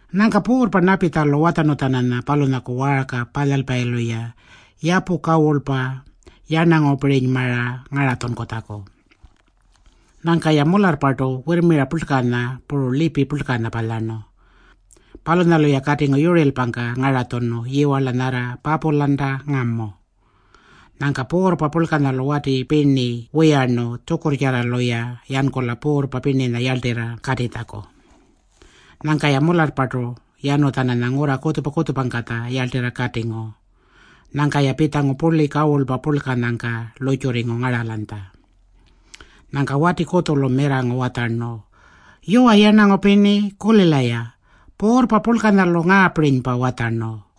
Nyangka puurrpa Napitjalu watjarnu-tjananya palunyaku waarka palyalpayilu-ya yapu kawurlpa yarnangupirinymara ngaratjunkutjaku. Nyangka-ya mularrpartu wirrmira purlkanya puru lipi purlkanya palyarnu. Palunyalu-ya katingu yurirlpangka ngaratjunu yiwarla nyarra Papulanta ngamu. Nyangka puurrpa purlkanyalu wati pirni wiyarnu tjukurrtjarralu-ya yankula puurrpa pirninya yarltirra katitjaku. Nyangka-ya mularrpartu yanu-tjananya ngurra kutjupa-kutjupangkatja yarltirra katingu. Nyangka-ya pitjangu purli kawurlpa palunyangka lurrtjurringu ngaralanytja. Nyangka wati kutjulu mirrangu watjarnu, “Yuwa yarnangu pirni, kulila-ya. Puurrpa purlkanyalu ngaapirinypa watjarnu: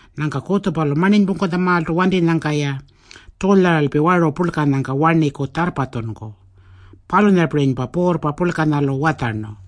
Nyangka kutjupalu marninypungkutjamaaltu wantinyangka-ya tjulyaralpi waru purlkanyangka warniku tjarrpatjunku. Palunyapirinypa puurrpa purlkalu watjarnu.”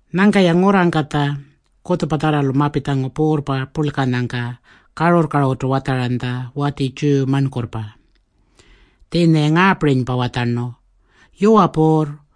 Nyangka-ya ngurrangkatja kutjupatjarralu mapitjangu puurrpa purlkanyangka karurr-karurrtu watjaranytja wati Tjiyu marnkurrpa. Tjiinya-ya ngaapirinypa watjarnu, “Yuwa puurr,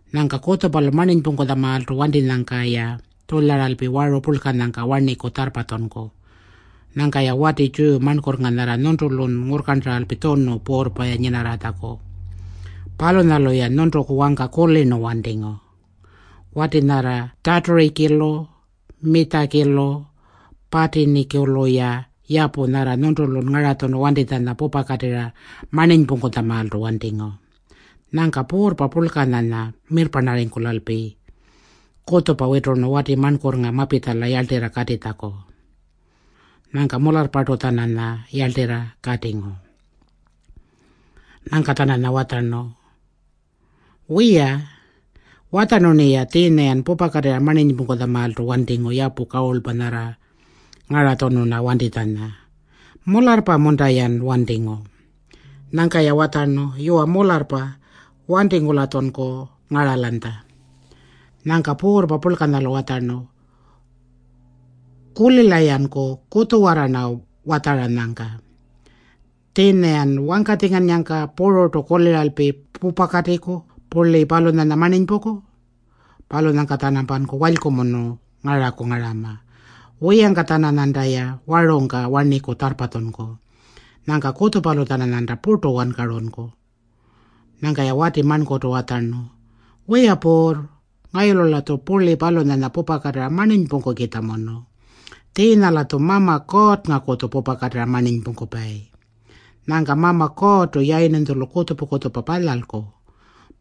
Nyangka kutjupalu marninypungkutjamaaltu wantinyangka-ya tjulyaralpi waru purlkanyangka warniku tjarrpatjunku. Nyangka-ya wati Tjiyu marnkurrnga nyarra nyuntulun ngurrkarntaralpi tjunu puurrpa-ya nyinarratjaku, palunyalu-ya nyuntuku wangka kulirnu wantingu. Wati nyarra Tjaturikilu Mitjakilu Patinikulu-ya yapu nyarra nyuntulun ngaratjunu wantitjanya pupakatirra marninypungkutjamaaltu wantingu.” Nyangka puurrpa purlkanyanya mirrparnarringkulalpi kutjupa witurnu wati marnkurrnga mapitjala yarltirra katitjaku. Nyangka mularrpartu-tjananya yarltirra katingu. Nyangka-tjananya watjarnu, “Wiya, watjarnu-rniya tjiinya-yan pupakatirra marninypungkutjamaaltu wantingu yapu kawurlpa nyarra ngaratjunu-rna wantitjanya. Mularrpa-munta-yan wantingu?” Nyangka-ya watjarnu, “Yuwa, mularrpa. Wantingu-latjunku ngaralanytja.” Nyangka puurrpa purlkanyalu watjarnu, “Kulila-yanku kutjuwarra-rna watjaranyangka. Tjiinya-yan wangkatjingannyangka pururtu kuliralpi pupakatiku purli palunyanya marninypungku. Palunyangka-tjanampanku walykumunu ngaraku ngarama. Wiyangka-tjananyantaya warungka warniku tjarrpatjunku. Nyangka kutjupalu-tjananyanta purtu wankarunku.” Nyangka-ya wati marnkurrtu watjarnu, “Wiya puurr, ngayulu-latju purli palunyanya pupakatirra marninypungkukitjamunu. Tjiinya-latju Mama Kuurrngakutju pupakatirra marninypungkupayi. Nyangka Mama Kuurrtu yayirninytjulu kutjupa-kutjupa palyalku.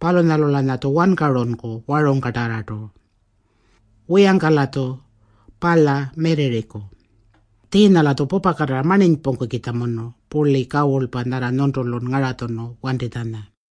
Palunyalu-lanyatju wankarunku warungkatarrartu. Wiyangka-latju palya mirrirriku. Tjiinya-latju pupakatirra marninypungkukitjamunu purli kawurlpa nyarra nyuntulun ngaratjunu wantitjanya.”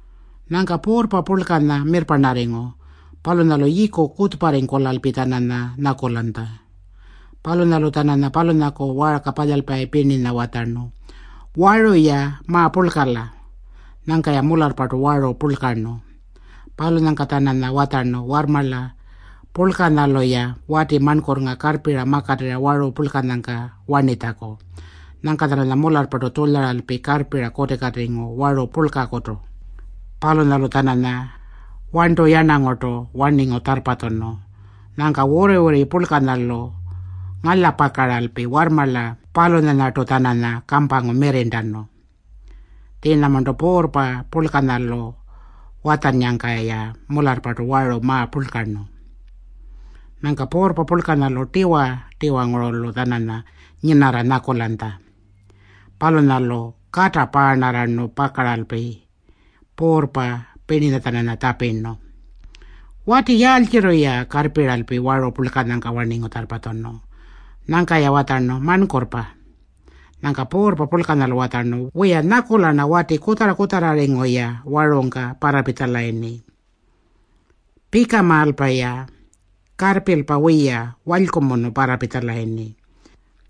Nyangka puurrpa purlkanya mirrparnarringu. Palunyalu yiiku kutjupa-kutjuparringkulalpi-tjananya nyakulanytja. Palunyalu-tjananya palunyaku waarka palyalpayi pirninya watjarnu, “Waru-ya ma-purlkala.” Nyangka-ya mularrpartu waru purlkarnu. Palunyangka-tjananya watjarnu warrmarla purlkanyalu-ya wati marnkurrnga karrpira makatirra waru purlkanyangka warnitjaku. Nyangka-tjananya mularrpartu tjulyaralpi karrpira kutikatingu waru purlkakutu. Palunyalu-tjananya warntuyarnangurtu warningu tjarrpatjunu. Nyangka wurri-wurri purlkanyalu ngalyapakaralpi warrmarla palunyanyartu-tjananya kampangu mirrirntanu. Tjiinyamarntu puurrpa purlkanyalu watjannyangka-ya mularrpartu waru ma-purlkarnu. Nyangka puurrpa purlkanyalu tiwa-tiwangurulu-tjananya nyinarra nyakulanytja. Palunyalu kata paarnarrarnu pakaralpi puurrpa pirninya-tjananya tjapirnu, “Wati yaaltjirri-ya karrpiralpi waru purlkanyangka warningu tjarrpatjunu?” Nyangka-ya watjarnu, “Marnkurrpa.” Nyangka puurrpa purlkanyalu watjarnu, “Wiya, nyakula-rna wati kutjarra-kutjarrarringu-ya warungka parrapitjalayirni. Pikamaalpa-ya, karrpilpa wiya, walykumunu parrapitjalayirni.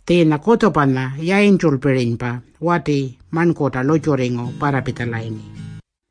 Tjiinya kutjupanya yayintjulpirinypa wati marnkurrta lurrtjurringu parrapitjalayirni.”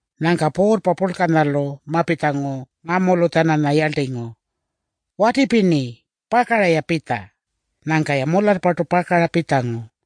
Nyangka puurrpa purlkanyalu mapitjangu ngamulu-tjananya yarltingu, “Wati pirni, pakara-ya pitja.” Nyangka-ya mularrpartu pakara pitjangu.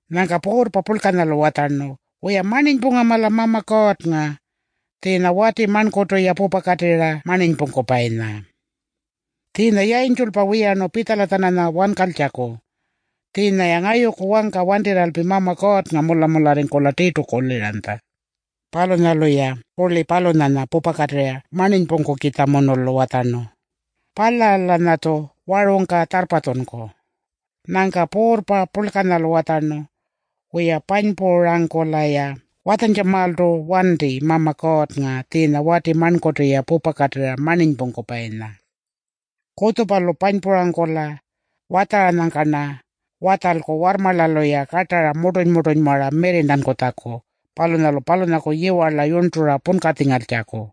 Nyangka puurrpa purlkanyalu watjarnu, “Wiya, marninypungama-la Mama Kuurrnga tjiinya wati marnkurrtu-ya pupakatirra marninypungkupayinya. Tjiinya yayintjulpa wiyarnu pitjala-tjananya wankaltjaku. Tjiinya-ya ngayuku wangka wantirralpi Mama Kuurrnga mula-mularringkula tirtu kuliranytja. Palunyalu-ya purli palunyanya pupakatirra marninypungkukitjamunulu watjarnu, ‘Palya-lanyatju warungka tjarrpatjunku.’” Nyangka puurrpa purlkanyalu watjarnu, “Wiya, panypurangkula-ya watjantjamaaltu wanti Mama Kuurrnga tjiinya wati marnkurrtu-ya pupakatirra marninypungkupayinya. Kutjupalu panypurangkula watjaranyangka-rna watjalku warrmarlalu-ya kartara murtuny-murtunymara mirrirntankutjaku palunyalu palunyaku yiwarla yurntura punkatjingaltjaku.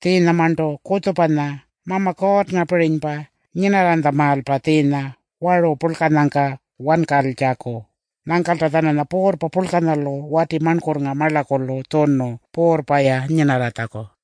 Tjiinyamarntu kutjupanya Mama Kuurrngapirinypa nyinarranytjamaalpa tjiinya waru purlkanyangka wankaltjaku.” Nyangkalta-tjananya puurrpa purlkanyalu wati marnkurrnga marlakulu tjunu puurrpa-ya nyinarratjaku.